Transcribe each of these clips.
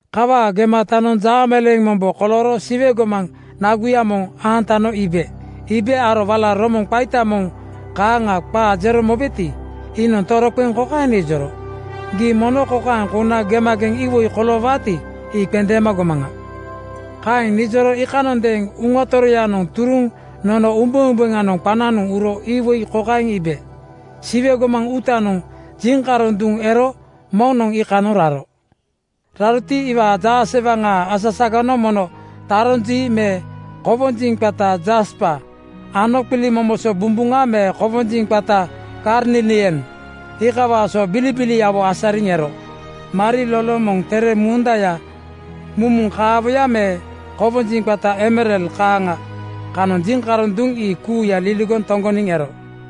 Kawaa gematanoŋ jaameleeŋ mombo kolooro Siwe gomaŋ naguya moŋ aantano iibe. Iibe aro wala romoŋ qaita moŋ (biugel) kaaŋa qaa jero mobeti, iinoŋ toroqeŋ kokaeŋ nijoro, “Gii mono kokaeŋ kouna gemageŋ iwoi koloowaati, ii qendeema gomaŋa.” Kaeŋ nijoro iikanondeeŋ Uŋa Toroyanoŋ turuŋ nono umbeumbeŋanoŋ qananoŋ uro iwoi kokaeŋ iibe: Siwe gomaŋ uutanoŋ jiŋkaroŋ duŋ ero moŋnoŋ iikanoŋ raro. Raroti, iwaa jaasewaŋaa asasaganoŋ mono taronjii me kowonjiŋ qata jaspa ano qilimomoso bumbuŋa me kowonjiŋ qata karnilian iikawaa so bilibiliawo asariŋ ero. Mariloloŋ moŋ tere mundaya mumuŋ kaawoya me kowonjiŋ qata emerald kaaŋa kanoŋ jiŋkaroŋ duŋ ii kuuya liligoŋ toŋgoniŋ ero.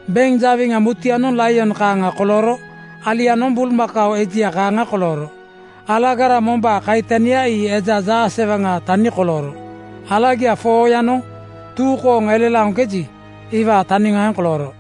Beŋ jawiŋa mutuyanoŋ laion kaaŋa kolooro. Alianoŋ bulmakao ejia kaaŋa kolooro. Alagara mombaa kaitania ii eja jaasewaŋaa tani kolooro. Alagia 4:yanoŋ tuu kooŋ elelaoŋkeji, iwaa taniŋaaŋ kolooro.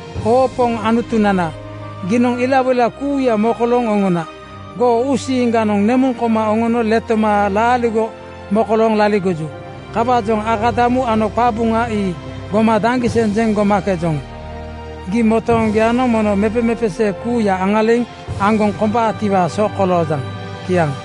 “Oo Poŋ Anutunana, giinoŋ ilawoila kuuya mokolooŋ oŋona. Goo uusiiŋganoŋ nemuŋ koma oŋono letoma laaligo mokolooŋ laligoju. Kawaajoŋ akadamu ano qabuŋa ii goma daŋgiseŋ jeŋ gomakejoŋ. Gii motooŋgoyanoŋ mono mepeqepesee kuuya aŋaliŋ aŋgoŋ kombaatiwaa so koloojaŋ.” Kiaŋ.